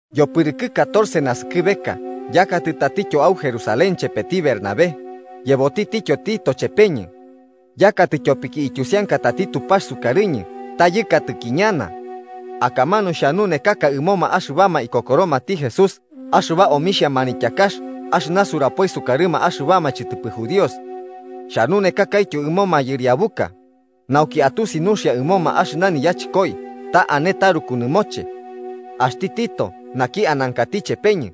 Yopɨrɨkɨ catorce naskɨbeka yakatɨ tatityo au Jerusalén chepeti Bernabé, yebotitityo Tito chepeñɨ. Yakatɨ tyopiki ityusiankatati Tupax sukarɨñɨ ta yɨkatɨki ñana. Akamanu xhanunekaka ɨmoma axɨbama ikokoromati Jesús axɨba omixhia manityakax axɨna surapoi sukarɨma axɨbama chɨtɨpɨ judíos. Xhanunekakaityo ɨmo mayɨriabuka, nauki atusi nuxia ɨmoma axɨna niyachɨkoi ta ane taruku nɨmoche. Axti Tito naki anankati chepeñɨ,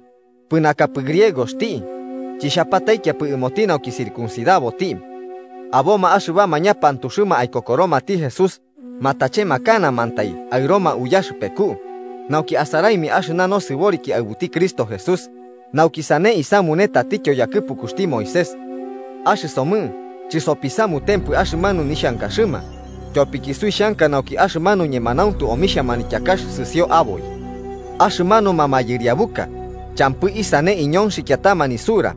pɨnakapɨ griegoxti, chixhapataikiapɨ ɨmoti nauki circuncidaboti. Aboma axɨbama ñapantuxɨma aikokoromati Jesús, matanekanamantai aɨroma uyaxɨpeku, nauki asaraimia axɨna nosɨboriki aɨbuti Cristo Jesús nauki sane isamune tatityo yakɨpukuxti Moisés. Axɨsomɨ chɨsopisamutempɨ axɨmanu nixhankaxɨma, tyopiki suixhanka nauki axɨmanu ñemanauntu omixhia manityakax sɨsio aboi. Axɨmanuma mayɨriabuka champɨ isane iñonxikiatama nisura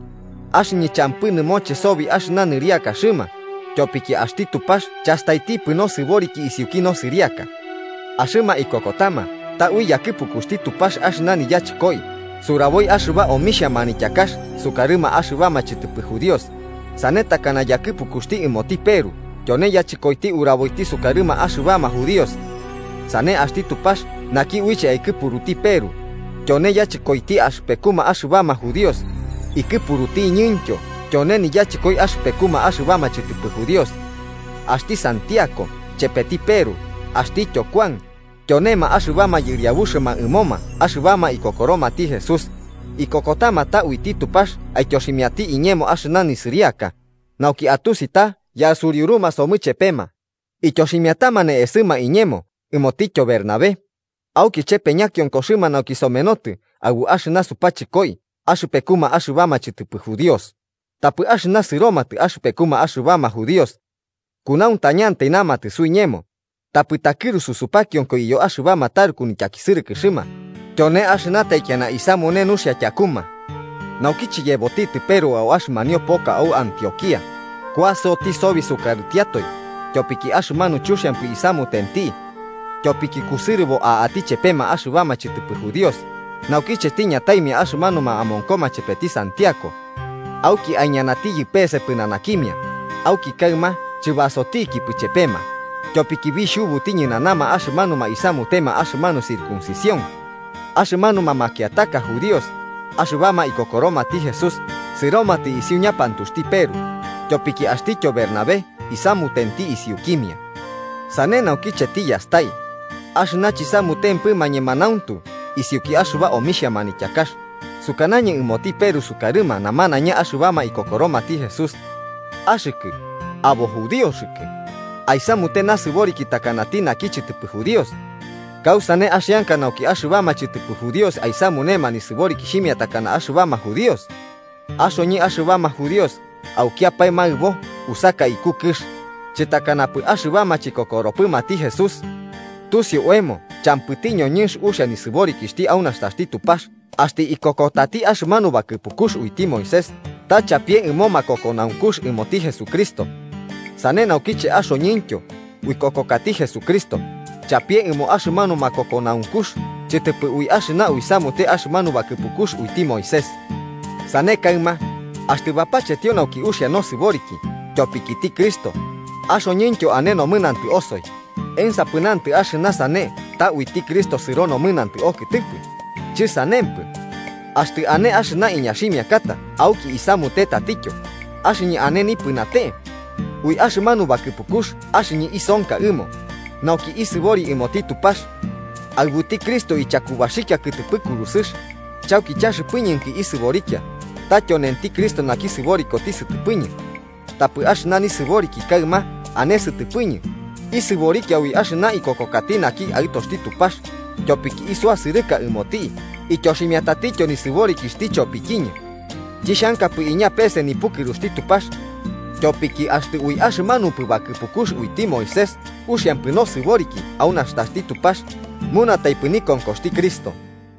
(axɨñɨ champɨ nɨmoche sobi axɨna nɨriakaxɨma, tyopiki axti Tupax chastaitipɨ nosɨboriki isiuki nosɨriaka). Axɨma ikokotama ta ui yakɨpukuxti Tupax axɨna niyachɨkoi suraboi axɨba omixhia manityakax sukarɨma axɨbama chɨtɨpɨ judíos, sane takana yakɨpukuxti ɨmoti Peru tyone yachɨkoiti uraboiti sukarɨma axɨbama judíos. Sane axti Tupax naki uiche aikɨpuruti Peru tyone yachɨkoiti axɨpekuma axɨbama judíos, ikɨpurutiñɨntyo tyone niyachɨkoi axɨpekuma axɨbama chɨtɨpɨ judíos. Axti Santiago chepeti Peru axtityo Kuan, tyonema axɨbama yɨriabuxɨma ɨmoma axɨbama ikokoromati Jesús, ikokotama ta uiti Tupax aityoximiati iñemo axɨna nisɨriaka, nauki atusi ta yasuriuruma somɨ chepema, ityoximiatama ne'esɨma iñemo ɨmotityo Bernabé, auki chepe ñakionkoxɨma nauki somenotɨ aɨbu axɨna supachɨkoi axɨpekuma axɨbama chɨtɨpɨ judíos, tapɨ axɨma sɨromatɨ axɨpekuma axɨbama judíos. Kunauntañantai namatɨ suiñemo tapɨ takɨrusu supakionko iyo axɨbama taruku nityakisɨrɨkɨxɨma, tyone axɨna taikiana isamune nuxia tyakuma. Naukiche yebotitɨ Peru au axɨmanio poka au Antioquía, kuasoti sobi sukarɨtiatoe, tyopiki axɨmanu chuxiampɨ isamutenti. Tyopiki kusɨrɨbo a'ati chepema axɨbama chɨtɨpɨ judíos, naukiche tiñataimia axɨmanuma amonkoma chepeti Santiago. Auki aiñanatiyɨ pese pɨnanakimia, auki kaɨma chɨbasotikipɨ chepema, tyopiki bixhubuti ñɨnanama axɨmanuma isamutema axɨmanu circuncisión. Axɨmanuma makiataka judíos axɨbama ikokoromati Jesús sɨromatɨ isiu ñapantuxti Peru, tyopiki axtityo Bernabé isamutenti isiukimia. Sane naukiche tiyastai, axɨna chisamutempɨma ñemanauntu isiuki axɨba omixhia manityakax, sukanañɨ ɨmoti Peru sukarɨma namanaiña axɨbama ikokoromati Jesús: “Axɨkɨ, abo judíoxɨkɨ, aisamute nasɨboriki takanati naki chɨtɨpɨ judío. ¿Kausane axianka nauki axɨbama chɨtɨpɨ judíos aisamunema nisɨborikixhimia takana axɨbama judíos?” Axoñɨ axɨbama judíos aukiapae maɨbo usaka iku kɨx, chɨtakanapɨ axɨbama chikokoropɨmati Jesús. Tusiu oemo champɨti ñoñɨnx uxia nisɨborikixhti au nastaxti Tupax axtɨ ikokotati axɨmanu bakɨpukux uiti Moisés ta chapie ɨmo makokonaunkux ɨmoti Jesucristo. Sane naukiche, axoñɨntyo uikokokati Jesucristo, chapie ɨmo axɨmanu makokonaunkux chɨtɨpɨ ui axɨna uisamute axɨmanu bakɨpukux uiti Moisés. Sane kaɨma, axtɨ bapachetio nauki uxia nosɨboriki tyopikiti Cristo, axoñɨntyo ane nomɨnantɨ osoi, ¿ensapɨ nantɨ axɨna sane ta uiti Cristo sɨro nomɨnantɨ okɨtɨpɨ? ¡Chɨsanempɨ! Axtɨ ane axɨna iñaximiakata auki isamute tatityo, axɨñɨ ane nipɨnate. Ui axɨmanu bakɨpukux axɨñɨ isonka ɨmo, nauki isɨbori ɨmoti Tupax. Aɨbuti Cristo ichakubaxikia kɨtɨpɨ kurusɨx, chauki chaxɨpɨñɨnki isɨborikia, ta tyonenti Cristo naki sɨborikoti sɨtɨpɨñɨ. Tapɨ axɨna nisɨboriki kaɨma ane sɨtɨpɨñɨ, isɨborikia ui axɨna ikokokati naki Aɨtoxti Tupax, tyopiki isuasɨrɨka ɨmoti ityoximiatatityo nisɨborikixhti chopikiñɨ. Chixhankapɨ iña peese nipukɨruxti Tupax. Tyopiki axtɨ ui axɨmanupɨ bakɨpukux uiti Moisés uxiampɨ nosɨboriki au nastaxti Tupax, munataipɨ nikonkoxti Cristo.